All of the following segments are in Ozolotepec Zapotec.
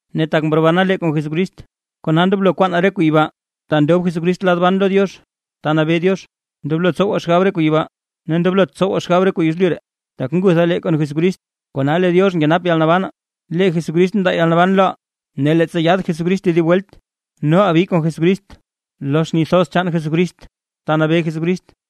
Ne tak mrobana lee kon Jesucrist, kona ndoblo kwaanaa re kuu yibaa, ta ndob Jesucrist lad ban lo Diox, ta nabee Diox. Ndoblo tsowaa xgab re kuu yibaa, ne ndoblot tsowaa xgab re kuu yezlyu ree, tak ngutha lee kon Jesucrist, kona lee Diox nkenap yalnabanaa. ¡Lee Jesucrist ndaa yalnaban loʼaa! Ne leettsa yaad Jesucrist tedib welt, noʼaa bi kon Jesucrist lo xni thoz chaan Jesucrist ta nabee Jesucrist.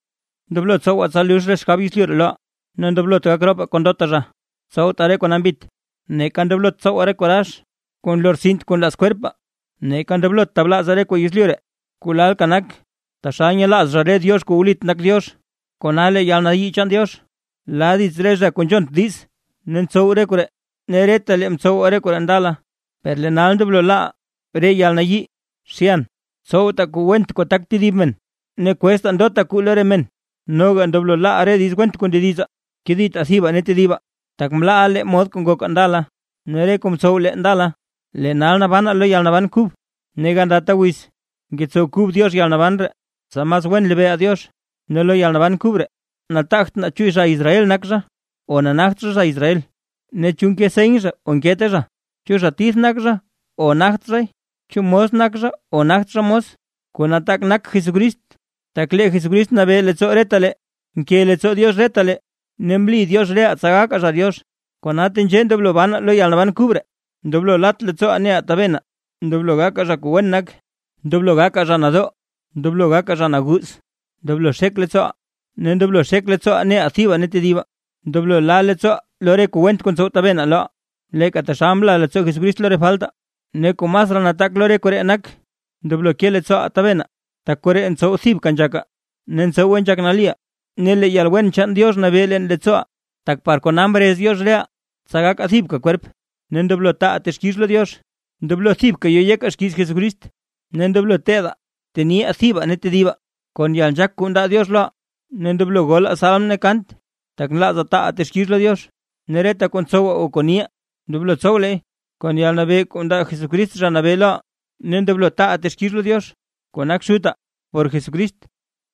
Ndoblo tsowaa tsa lux re xgab yezlyu ree loʼaa: Ne ndoblot gak ropaa kon ndota zha, tsowtaa re kuu nambit, neeka ndoblot tsowaa re kuu rax, kuu nlortsint kuu nlaaz kwerpaa, neeka ndoblot tablaazaa re kuu yezlyu ree kuu lalka nak, taxal nyelaaz zha re diox kuu wlit nak Diox. Kona lee yalnayii chaan Diox la dits re zha kuu nzhont diiz ne ntsow re koree, ne retalee mtsowaa re koree ndala. Per lee nal ndoblo laaʼaa re: yalnayii, zhyan, tsowtaa kuu went kuu tak tedib men, ne kweztaa ndota kuu lo re men, noga ndoblo laa reʼaa re diiz went kuu ndedizaa. Keditaa thibaa ne tedibaa. Tak mlaaʼa lee mod kuu ngokaa ndala ne re kuu mtsow lee ndala, lee nal nabanaa lo yalnaban kub, ne gandata wiz ngetsow kub Diox yalnaban ree, tsa mas wen lebeeʼaa Diox. Ne lo yalnaban kub ree, nataagt naa chu zha Israel nak zha o nagt zha zha Israel, ne chu nke seny zha o nkete zha, chu zha tith nak zha o nagt zhay, chu mos nak zha o nagt zha mos. Kuu nataak nak Jesucrist, tak lee Jesucrist nabee leettsoo retalee. Nke leettsoo Diox retalee, ne mli Diox reʼaa tsa gakaa zha Diox. Kona tenzhee ndoblo banaa lo yalnaban kub ree: ndoblo lat leettsooʼaa neʼaa tabenaa, ndoblo gakaa zha kuu wen nak, ndoblo gakaa zha nadoo, ndoblo gakaa zha naguuz, ndoblo xek leettsooʼaa, ne ndoblo xek leettsooʼaa neʼaa thibaa ne tedibaa, ndoblo la leettsooʼaa lo re kuu went kuu ntsow tabenaa loʼaa, leeka taxal mla leettsoo Jesucrist lo re faltaa. Ne kuu masraa nataak lo re koree nak: Ndoblo ke leettsooʼaa tabenaa, tak koree ntsow thibka nzhakaa ne tsowe nzhak naliʼaa. Ne lee yalwen chaan Diox nabee leen leettsooʼaa, tak par kona mrez Diox reʼaa, tsa gakaa thibka kwerp, ne ndoblo taaʼaa texkix lo Diox. Ndoblo thibka yo yekaa xkiiz Jesucrist, ne ndoblo teedaa teniʼaa thibaa ne tedibaa kon yalnzhaak kuu ndaa Diox loʼaa. Ne ndoblo golaa salm ne kant, tak nlaazaa taaʼaa texkix lo Diox. Ne reta kuu ntsowaa o kuu niʼaa, ndoblo tsow leey kon yalnabee kuu ndaa Jesucrist Zha Nabee loʼaa, ne ndoblo taaʼaa texkix lo Diox kuu nak Xutaa por Jesucrist.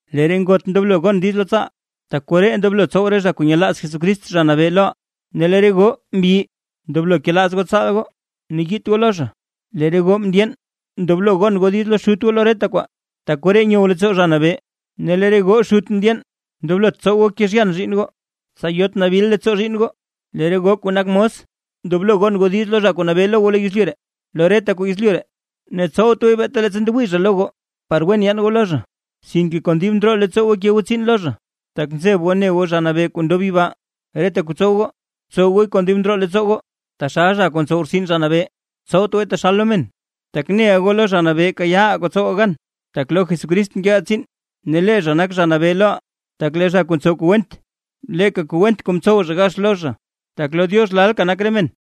Lee re ngot ndoblo gon diiz lo tsaal, tak koree ndoblo tsow re zha kuu nyelaaz Jesucrist Zha Nabee loʼaa. Ne lee re goo mbyi ndoblo kelaaz goo tsaal goo, ne yiit goo lo zha. Lee re goo mndyeen ndoblo gon diiz lo xut lo reta kwaa, tak koree nyow leettsoo Zha Nabee. Ne lee re goo xut mndyeen ndoblot tsow goo kezhyan zhiinn goo, tsa yot nabil leettsoo zhiinn goo. Lee re goo kuu nak mos ndoblo gon goo diiz lo zha kuu nabee lo goo lo yezlyu ree, lo reta kuu yezlyu ree. Ne tsowt gooy beeta leettsa ndewii zha lo goo par wen yaan goo lo zha, sinke kon dib ndroo leettsoo goo bke goo tsiin lo zha, tak nzeb goo lo Zha Nabee kuu ndob yibaa. Reta kuu tsow goo, btsow gooy kon dib ndroo leettsoo goo, taxal zha kuu ntsow rtsin Zha Nabee, tsowt gooy taxal lo men. Tak neʼa goo lo Zha Nabee kayaaʼaa kuu tsowaa gan, tak lo Jesucrist nkeʼaa tsiin ne lee zha nak Zha Nabee loʼaa. Tak lee zha kuu ntsow kuu went, leeka kuu went kuu mtsow zha gax lo zha, tak lo Diox lalka nak re men.